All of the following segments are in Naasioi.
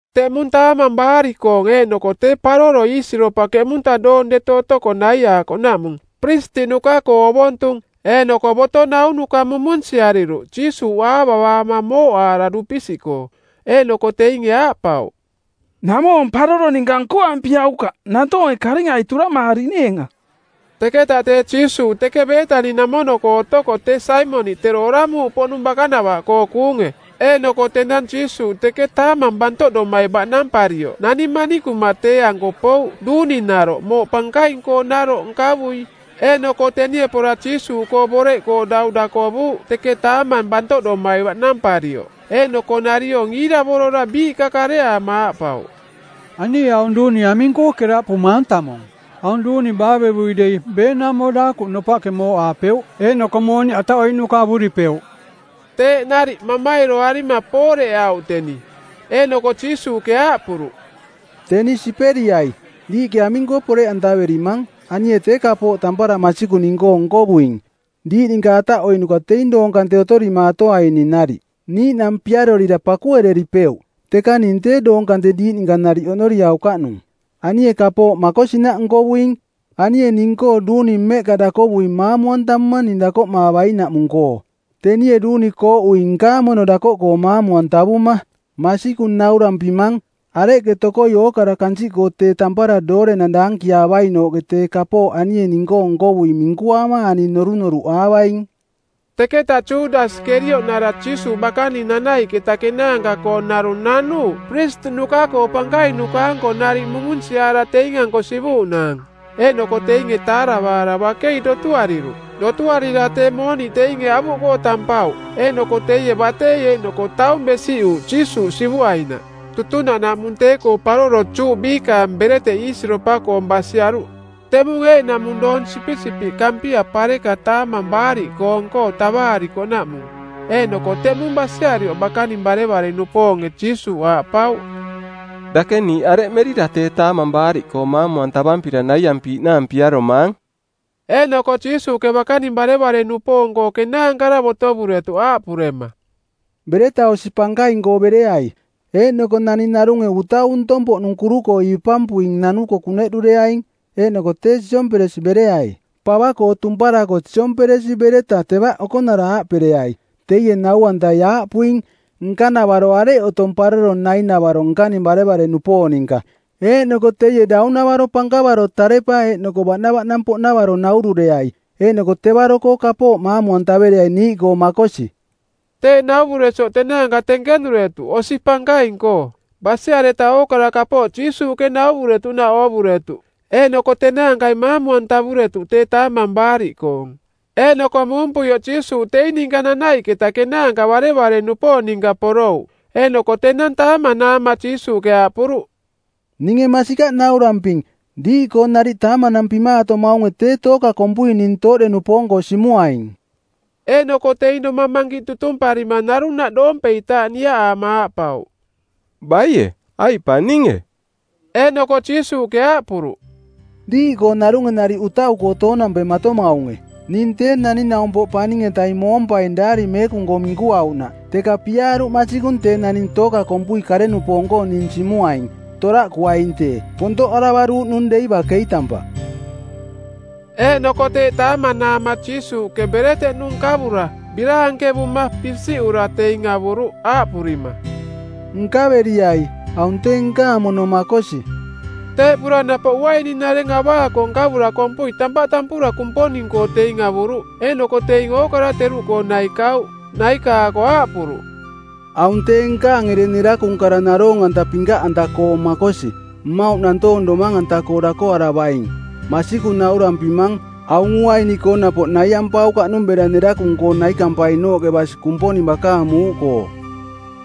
Teꞌmung Taamang Baariꞌkoong˜ eeꞌnoko tee Paroro Iisiropa keꞌmunta doong deto otoko naiaakoꞌnaꞌmung, piristiꞌnuka-koo ovontung eeꞌnoko boto naunuka mumunsiariruꞌ Jiisuuꞌ aavavaama mooꞌaara dupisiꞌkoo. Eeꞌnoko teinge aaꞌpauꞌ, “Naꞌmoo paroro ninka nkoampiaukaꞌ nantoonge karingai turamaariꞌneenga.” Teketa tee Jiisuuꞌ teke Beetani-namono-koo otoko tee Saimoniꞌ tero oramuuꞌpoꞌnung bakanava-koo kuunge. Eeꞌnoko tenang Jiisuuꞌ teke taamang bantoꞌdomai baꞌnamparioꞌ nani manikuma tee-anko pouꞌ duuninaroꞌ mooꞌ pankaing-koonaroꞌ nkavui. Eeꞌnoko tenie pora Jiisuuꞌkoo boreꞌkoo dau dakovuuꞌ teke taamang bantoꞌdomai baꞌnamparioꞌ. Eeꞌnoko nariong iiravorora biiꞌka kareaama aaꞌpauꞌ, “Anie aung duuni aming-koo keraꞌpumaang tamung? Aung duuni baavevui dei beenaumo daakuꞌ nopaꞌke mooꞌaapeuꞌ eeꞌnoko mooniꞌ ataꞌoiꞌnuka avuripeuꞌ.” Teeꞌ nariꞌ mamairoarima pooreꞌauꞌ teni. Eeꞌnoko Jiisuuꞌke aaꞌpuruꞌ, “Teni siperiai. Diiꞌke aming-koo poreꞌantaverimang? Anie tee kapooꞌ tampara masikung ning-koo nkovuing. Diiꞌ ninka ataꞌoiꞌnuka teing doong kante otorimaatoaining nariꞌ. Niiꞌnang piarorira pakuereripeuꞌ. Teka ning tee doong kante diiꞌ ninka oꞌnoriaukaꞌnung. Anie kapooꞌ makosinaꞌ nkovuing. Anie ning-koo duuni mmeꞌka dakovuing maamu-antamuma ning dakoꞌmaavainaꞌmung-koo. Tenie duuni kooꞌuing nkaang mono dakoꞌkoo maamu-antavuma. Masikung naurampimang: Areꞌke tokoi ookara kansiꞌkoo tee tampara doorenang daankiaavainooꞌke tee kapooꞌ anie ning-koo nkovuing minkuaama ani norunoruꞌaavaing.” Teketa Judasi Kerioꞌnara Jiisuuꞌ bakaning nanaiꞌketa kenaanka-koo narung nanuuꞌ piristiꞌnuka-koo pankainuka-anko nariꞌ mumunsiaara teing-anko sivuuꞌnaang. Eeꞌnoko teinge taaravaara bakei dotuariruꞌ. Dotuarira tee mooniꞌ teinge avuꞌkoo tampauꞌ. Eeꞌnoko teie batei eeꞌnoko taung besiꞌuuꞌ Jiisuuꞌ sivuainaꞌ. Tutunaꞌnaꞌmung tee-koo paroro Juꞌ biikaang bereteꞌ iisiropa-koong basiaruꞌ. Teꞌmung eeꞌnaꞌmung doong sipisipiꞌ kampia pareka Taamang Baariꞌkoong-koo tavaarikoꞌnaꞌmung, eeꞌnoko teꞌmung basiarioꞌ bakaning barevare-nupoonge Jiisuuꞌ aaꞌpauꞌ, “Dake niiꞌ areꞌ merira tee Taamang Baariꞌkoong˜ maamu-antavampira naiampiiꞌnaang piaromaang?” Eeꞌnoko Jiisuuꞌke bakaning barevare-nupoong-koo kenaankara botovuretuꞌ aaꞌpurema, “Bereta osi pankaing-koo bereai. Eeꞌnoko naning narunge utau ntong-poꞌnung kuru-koo ipampui nanuko kuneꞌdureaing. Eeꞌnoko tee siomperesi bereai. Pava-koo tumparako siomperesi bereta tevaꞌ okonara aaꞌpereai, ‘Teie nau-antai aaꞌpuing, “Nkanavaro areꞌ otong paroro nai-navaro nkaning barevare-nupoong ninka?” ’ Eeꞌnoko teie daunavaro pankavaro tarepa eeꞌnoko baꞌnavaꞌnang-poꞌnavaro naurureai. Eeꞌnoko tevaro-koo kapooꞌ maamu-antavereai niiꞌkoo makosi.” Teeꞌ nauvuresioꞌ tenaanka tenkenuretuꞌ osi pankaing-koo. Basiareta ookara kapooꞌ Jiisuuꞌke nauvuretuꞌnaꞌ oovuretuꞌ. Eeꞌnoko tenaankai maamu-antavuretuꞌ tee Taamang Baariꞌkoong. Eeꞌnoko muumpuioꞌ Jiisuuꞌ teing ninka nanaiꞌketa kenaanka barevare-nupoong ninka porouꞌ. Eeꞌnoko tenang taamanaama Jiisuuꞌke aaꞌpuruꞌ, “Ninge masikaꞌ nauramping, diiꞌkoo nariꞌ taamanampimaatomaunge tee tooka kompui ning tooꞌde-nupoong-koo simuaing.” Eeꞌnoko teing domang mankiꞌ tutumparima narunaꞌ doompeitaaꞌ niaꞌaama aaꞌpauꞌ, “Baie? Aiꞌ pa ninge?” Eeꞌnoko Jiisuuꞌke aaꞌpuruꞌ, “Diiꞌkoo narunge nariꞌ utau-koo toonampematomaunge. Ning Tee Naning-naumpoꞌ Paning-etaing moompaing Daari Meekung-koo minkuauꞌnaꞌ, teka piaaruꞌ masikung tee naning tooka kompui kare-nupoong-koo ning simuaing. Toraꞌkuainung tee. Pontoꞌaravaruuꞌnung dei bakei tampaꞌ.” Eeꞌnoko teeꞌ taamanaama Jiisuuꞌke bereteꞌnu nkavura, biraankevuma, pisiꞌura teing avuruꞌ aaꞌpurima, “Nkaveriai, aung tee nkaang mono makosi.” Teeꞌpura napoꞌ uaininareng avaako nkavura kompui tampaꞌ tampura Kumponing-koo teing avuruꞌ, eeꞌnoko teing ookara teruꞌkoo naikauꞌ. Naiaako aaꞌpuruꞌ, “Aung tee nkaang ereng nerakung kara naroong-anta pinkaꞌanta-koong makosi, mmauꞌ nantoong domang-anta-koo dakoaravaing. Masikung naurampimang, aung uaini-koo napoꞌ naiampaukaꞌnung bera nerakung-koo naikampainooꞌke basi Kumponing bakaang muuꞌkoo.”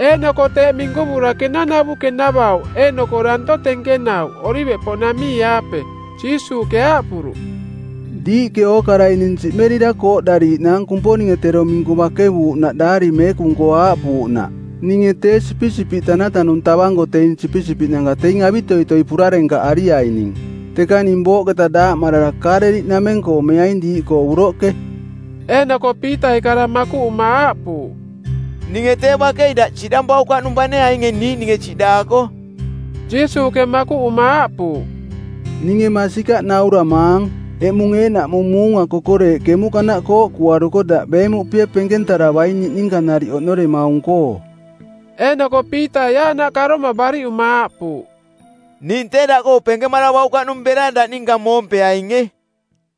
Eeꞌnoko teeꞌ minkuvura kenanavu kenavauꞌ eeꞌnoko danto tenkenauꞌ Oliveꞌpoꞌnamii-aape. Jiisuuꞌke aaꞌpuruꞌ, “Diiꞌke ookarai ning siꞌmerira kooꞌdariiꞌnaang Kumponinge tero minku bakevuuꞌnaꞌ Daari Meekung-koo aaꞌpuuꞌnaꞌ, ‘Ninge tee sipisipiꞌ tanatanung tavanko teing sipisipiꞌnanka teing avitoitoi purarenkaꞌariaining.’ Teka ning booꞌketa daaꞌmarara Kaaleliꞌnameng-koo meaing diiꞌkoo uroꞌke.” Eeꞌnoko Piitai kara makuꞌuma aaꞌpuuꞌ, “Ninge tee bakei daꞌ siꞌdampaukaꞌnung bane ainge niiꞌninge siꞌdaako.” Jiisuuꞌke makuꞌuma aaꞌpuuꞌ, “Ninge masikaꞌ nauramaang, eꞌmung eeꞌnaꞌmung muunga kokoreeꞌ kemuꞌkanaꞌ kooꞌkuaruko daꞌ beemuꞌpie penkentaravaing niꞌninka nariꞌ oꞌnoremaung-koo.” Eeꞌnoko Piitai aaꞌnaꞌ karoma bariꞌuma aaꞌpuuꞌ, “Ning tee daꞌkoo penkemaravaukaꞌnung bera daꞌ ninka moompeainge.”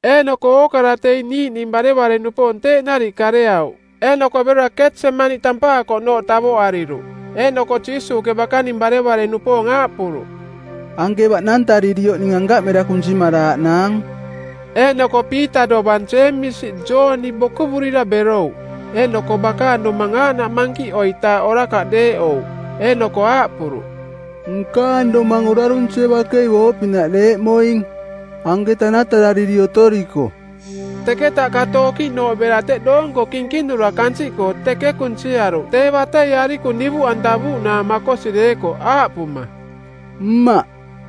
Eeꞌnoko ookara teing niiꞌning barevare-nupoong teeꞌ nariꞌ kareauꞌ. Eeꞌnoko berora ketsemani tampaakoꞌnooꞌ tavoꞌariruꞌ. Eeꞌnoko Jiisuuꞌke bakaning barevare-nupoong aaꞌpuruꞌ, “Anke baꞌnantaririoꞌ ning ankaꞌ mera kunsimaraaꞌnaang.” Eeꞌnoko Piita dovang Jeemisi, Jooni bokuvurira berouꞌ. Eeꞌnoko bakaang domang aaꞌnaꞌ mankiꞌoitaaꞌ orakaꞌ deeꞌouꞌ. Eeꞌnoko aaꞌpuruꞌ, “Nkaang domang orarunsie bakei booꞌpinaꞌ deeꞌmoing. Anke tanatarariri otoriko.” Teketa kato okiꞌnooꞌ bera teꞌ doonko kinkinura kansiꞌkoo teke kunsiaruꞌ tee batei arikung divuꞌantavuuꞌnaang makosi deekoꞌ, aaꞌpuma, “Mmaꞌ,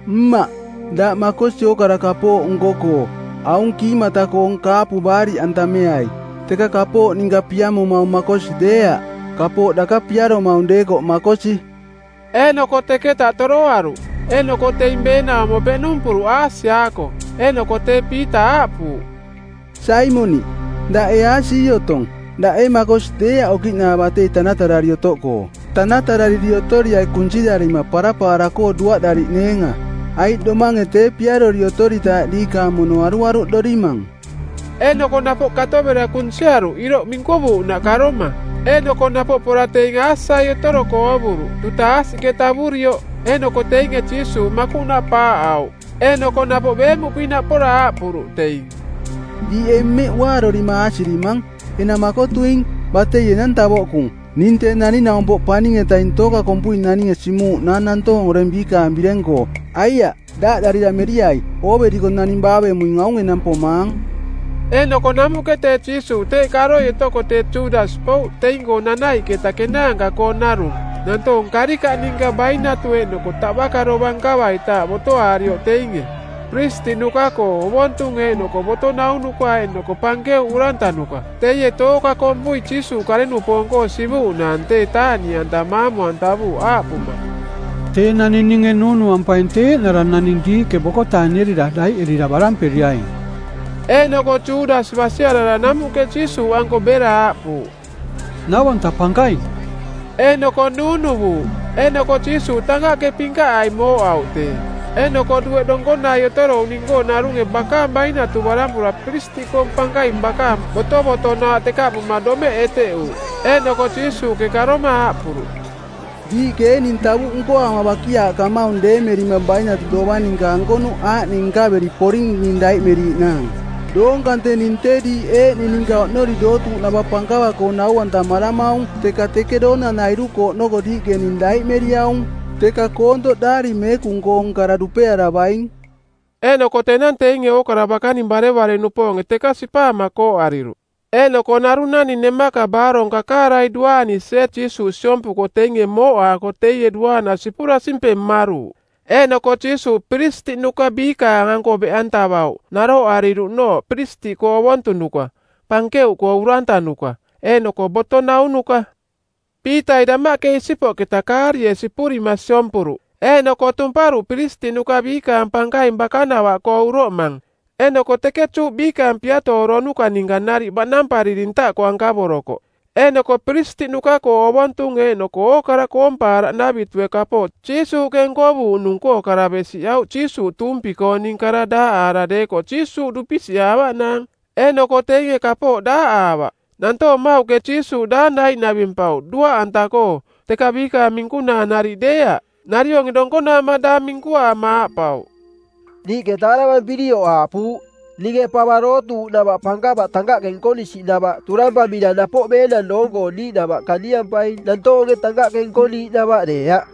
Mmaꞌ, daꞌ makosi ookara kapooꞌ nko-koo. Aung kiimata koong kaapu baariꞌantameai, teka kapooꞌ ninka piamomaung makosi deeaꞌ, kapooꞌ daka piaromaung deekoꞌ makosi.” Eeꞌnoko teketa toroaruꞌ. Eeꞌnoko teing beenaumo peꞌnumpuruꞌ aasiaako, eeꞌnoko tee Piita aaꞌpuuꞌ, “Saimoniꞌ, daꞌ ee aasii otong? Daꞌ ee makosi deeaꞌ okiꞌnooꞌ batei tanatarari otoꞌkoo?” “Tanatarariri otoriai kunsirarima parapaara-koo duaꞌdariꞌneenga, aiꞌ domange tee piarori otoritaaꞌ diikaang mono aruaruꞌdorimang.” Eeꞌnoko napoꞌ kato bera kunsiaruꞌ iroꞌ minkuvuuꞌnaꞌ karoma. Eeꞌnoko napoꞌ pora teeꞌ teing aasiai otoroko oovuruꞌ, duta aasiꞌke tavurioꞌ. Eeꞌnoko teinge Jiisuuꞌ makuꞌnaꞌ paaꞌauꞌ. Eeꞌnoko napoꞌ beemuꞌpinaꞌ pora aaꞌpuruꞌ teing, “Diiꞌ ee mmeꞌ uaarorima aasirimang? Enang makotuing. Batei enang tavoꞌkung. Ning Tee Naning-naumpoꞌ Paning-etaing tooka kompui naninge simuuꞌnaang nantoong oreng biikaang bireng-koo. Aiaꞌ, daaꞌdarira meriai. Ooveriko naning baavemuing aung enang pomaang.” Eeꞌnoko namuꞌke tee Jiisuuꞌ teeꞌ karoi otoko tee Judasi pouꞌ teing-koo nanaiꞌketa kenaanka-koong narung nantoong karikaꞌ ninka bainatu eeꞌnoko taꞌbaka dovang nkavaitaaꞌ botoaarioꞌ teinge: piristiꞌnuka-koo ovontung eeꞌnoko boto naunuka eeꞌnoko pankeuꞌ urantanuka. Teie tooka kompui Jiisuuꞌ kare-nupoong-koo sivuuꞌnaang tee taaꞌniꞌanta maamu-antavuuꞌ aaꞌpuma, “Tee naning ninge nuunuampaing tee eeꞌnara naning diiꞌke bokotaanierira daiꞌerira baramperiaing.” Eeꞌnoko Judasi basiarara namuꞌke Jiisuuꞌanko bera aaꞌpuuꞌ, “Nau-anta Pankaing!” Eeꞌnoko nuunuvuuꞌ. Eeꞌnoko Jiisuuꞌ tankaꞌke pinkaꞌai mooꞌauꞌ tee. Eeꞌnoko dueꞌ donkonai otorouꞌning-koo narunge bakaang bainatu barampura piristiꞌkoong pankaing bakaang botovotonaaꞌ tekaꞌpuma domeꞌ eteꞌuuꞌ. Eeꞌnoko Jiisuuꞌke karoma aaꞌpuruꞌ, “Diiꞌke ee ning tavuꞌ nkoaama bakiaaꞌkamaung deemerima bainatu dovang ninka ankonuꞌ aaꞌning nkaveri poring ning daiꞌmeriiꞌnaang? Doong kante ning tee diiꞌ eeꞌning ninka oꞌnori dootuuꞌnava pankava-koo nau-antamaramaung teka teke doonanairu-koo oꞌnoko diiꞌke ning daiꞌmeriaung. Teka koontoꞌ Daari Meekung-koong kara dupearavaing.” Eeꞌnoko tenang teinge ookara bakaning barevare-nupoonge teka sipaama kooꞌariruꞌ. Eeꞌnoko narung naning nemaka baarong kakaarai duaanisie Jiisuuꞌ siompuko teinge mooꞌaako teie duaana sipura simpeng mmaruuꞌ. Eeꞌnoko Jiisuuꞌ piristiꞌnuka biikaang-anko beꞌantavauꞌ naroꞌariruꞌnooꞌ piristiꞌkoo ovontunuka, pankeuꞌkoo urantanuka eeꞌnoko boto naunuka. Piitai damaꞌke isipoꞌketa kaarie sipurima siompuruꞌ eeꞌnoko tumparuꞌ piristiꞌnuka biikaang pankaing bakanavaꞌkoo uroꞌmang, eeꞌnoko teke Juꞌ biikaang piatooronuka˜ ninka nariꞌ baꞌnampariri ntaꞌkoo ankavorokoꞌ. Eeꞌnoko piristiꞌnuka-koo ovontung eeꞌnoko ookara koompaaraꞌnavitue kapooꞌ Jiisuuꞌke nkovuuꞌnung-koo kara besiꞌauꞌ Jiisuuꞌ tuumpi-kooning kara daaꞌaara deekoꞌ Jiisuuꞌ dupisiꞌaavaꞌnaang. Eeꞌnoko teinge kapooꞌ daaꞌaavaꞌ. Nantoong mmauꞌke Jiisuuꞌ daang daiꞌnavimpauꞌ duaꞌanta-koo, teka biikaang minkunaa nariꞌ deeaꞌ. Narionge donkonaama daang minkuaama aaꞌpauꞌ, “Niiꞌke taaravampirioꞌ aaꞌpuuꞌ, ‘Ninge pava dootuuꞌnava pankava tankaꞌke nkonisinavaꞌ turampamira napoꞌ beenang doong-koo niiꞌnava kaniampaing nantoonge tankaꞌke nkoniiꞌnava deeaꞌ.’”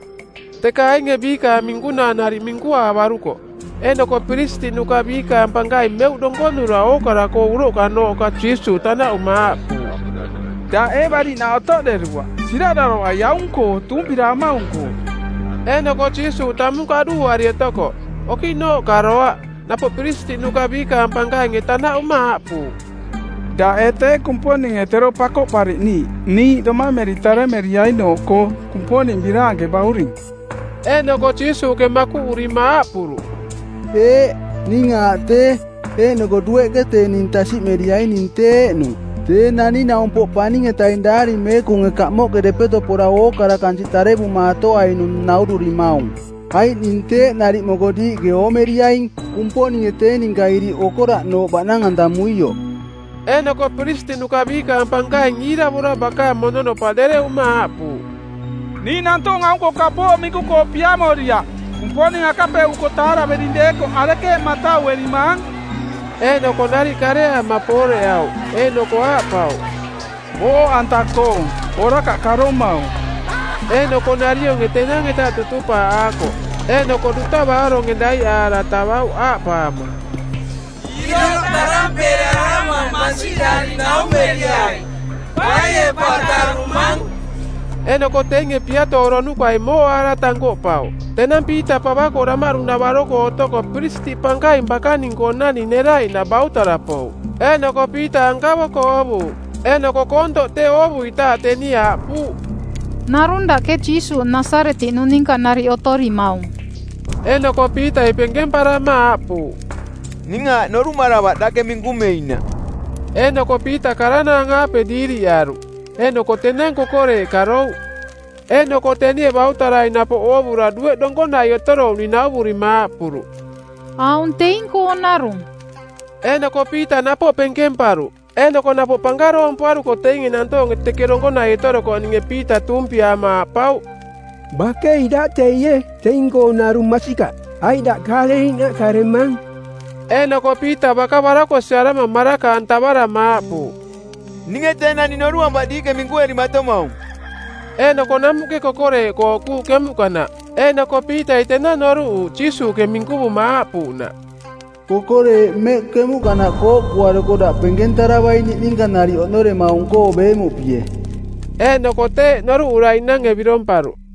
Teka ainge biikaang minkunaa nariꞌ minkuaavarukoꞌ. Eeꞌnoko piristiꞌnuka biikaang pankaing meuꞌ donkonura ookara-koo uroꞌkanooꞌka Jiisuuꞌ tanaꞌuma aaꞌpuuꞌ, “Daꞌ ee bariꞌnaꞌ otoꞌderuaꞌ? Siraꞌdaravai aung-koo tuumpiraamaung-koo!” Eeꞌnoko Jiisuuꞌ tamung kaꞌduuari otokoꞌ. Okiꞌnooꞌ karoaꞌ. Napoꞌ piristiꞌnuka biikaang pankainge tanaꞌuma aaꞌpuuꞌ, “Daꞌ ee tee Kumponinge tero Pakoꞌpariꞌniiꞌ niiꞌ domameri taremeriainooꞌkoo, Kumponing Biraanke Bauring?” Eeꞌnoko Jiisuuꞌke makuꞌurima aaꞌpuruꞌ, “Eeꞌ, ning aaꞌ tee. Eeꞌnoko dueꞌke tee ning tasiꞌmeriaing ning tee eeꞌnung, Tee Naning-naumpoꞌ Paning-etaing Daari Meekunge kamoꞌke depeto pora ookara kansiꞌ tarevumaatoainung naururimaung. Aiꞌ ning teeꞌ nariꞌ moko diiꞌke oomeriaing, Kumponinge tee ninka iriꞌ okoraꞌnooꞌ baꞌnang-antamuioꞌ.” Eeꞌnoko piristiꞌnuka biikaang pankaing iiravora bakaang mononopaꞌ dereꞌuma aaꞌpuuꞌ, “Niiꞌ nantoong aung-koo kapooꞌ minku-koo piamoriaꞌ. Kumponing akapeuꞌuko taaravering deekoꞌ arekeeꞌ matauerimaang?” Eeꞌnoko nariꞌ kareaama pooreꞌauꞌ, eeꞌnoko aaꞌpauꞌ, “Booꞌanta-koong, orakaꞌ karomaung.” Eeꞌnoko narionge tenang-eta tutupaaꞌaakoꞌ. Eeꞌnoko duta baaronge daiꞌaara tavauꞌ aaꞌpaama, “Iroꞌ tarampeerarama˜ mansiꞌdari naumeriai, ‘Baie pa tarumang?’” Eeꞌnoko teinge piatooronukai mooꞌaara tankoꞌpauꞌ. Tenang Piita pava-koo damaꞌdu-navaro-koo otoko Piristiꞌ Pankaing bakaning-koonani neraiꞌnaꞌ bautara pouꞌ. Eeꞌnoko Piita ankavoko oovuuꞌ, eeꞌnoko koontoꞌ tee oovuitaaꞌ tenie aaꞌpuuꞌ, “Narung dake Jiisuuꞌ Nasaretiꞌnung ninka otorimaung.” Eeꞌnoko Piitai penkemparama aaꞌpuuꞌ, “Ning aaꞌ noruꞌmaravaꞌ dake minkumeinaꞌ.” Eeꞌnoko Piita karanaang-aape diiriꞌaruꞌ. Eeꞌnoko tenang kokoreeꞌ karouꞌ. Eeꞌnoko tenie bautarai napoꞌ oovura dueꞌ donkonai otorouꞌning nauvurima aaꞌpuruꞌ, “Aung teing-koo narung.” Eeꞌnoko Piita napoꞌ penkemparuꞌ. Eeꞌnoko napoꞌ pankaroompuaruko teinge nantoonge teke donkonai otorokoꞌninge Piita tuumpiaama aaꞌpauꞌ, “Bakei daꞌ teie, teing-koo narung masikaꞌ, aiꞌ daꞌ Kaaleliꞌnaꞌ karemang.” Eeꞌnoko Piita baka barakosiꞌarama maraka-antavarama aaꞌpuuꞌ, “Ninge tee naning noruꞌampaꞌ diiꞌke minkuerimatomaung.” Eeꞌnoko namuꞌke kokoreeꞌ kooꞌkuuꞌ kemuꞌkanaꞌ. Eeꞌnoko Piitai tenang noruꞌuuꞌ Jiisuuꞌke minkuvuma aaꞌpuuꞌnaꞌ, “Kokoreeꞌ mmeꞌ kemuꞌkanaꞌ kooꞌkuaruko daꞌ penkentaravaing niꞌninka nariꞌ oꞌnoremaung-koo beemuꞌpie.” Eeꞌnoko teeꞌ noruꞌuraiꞌnange biromparuꞌ.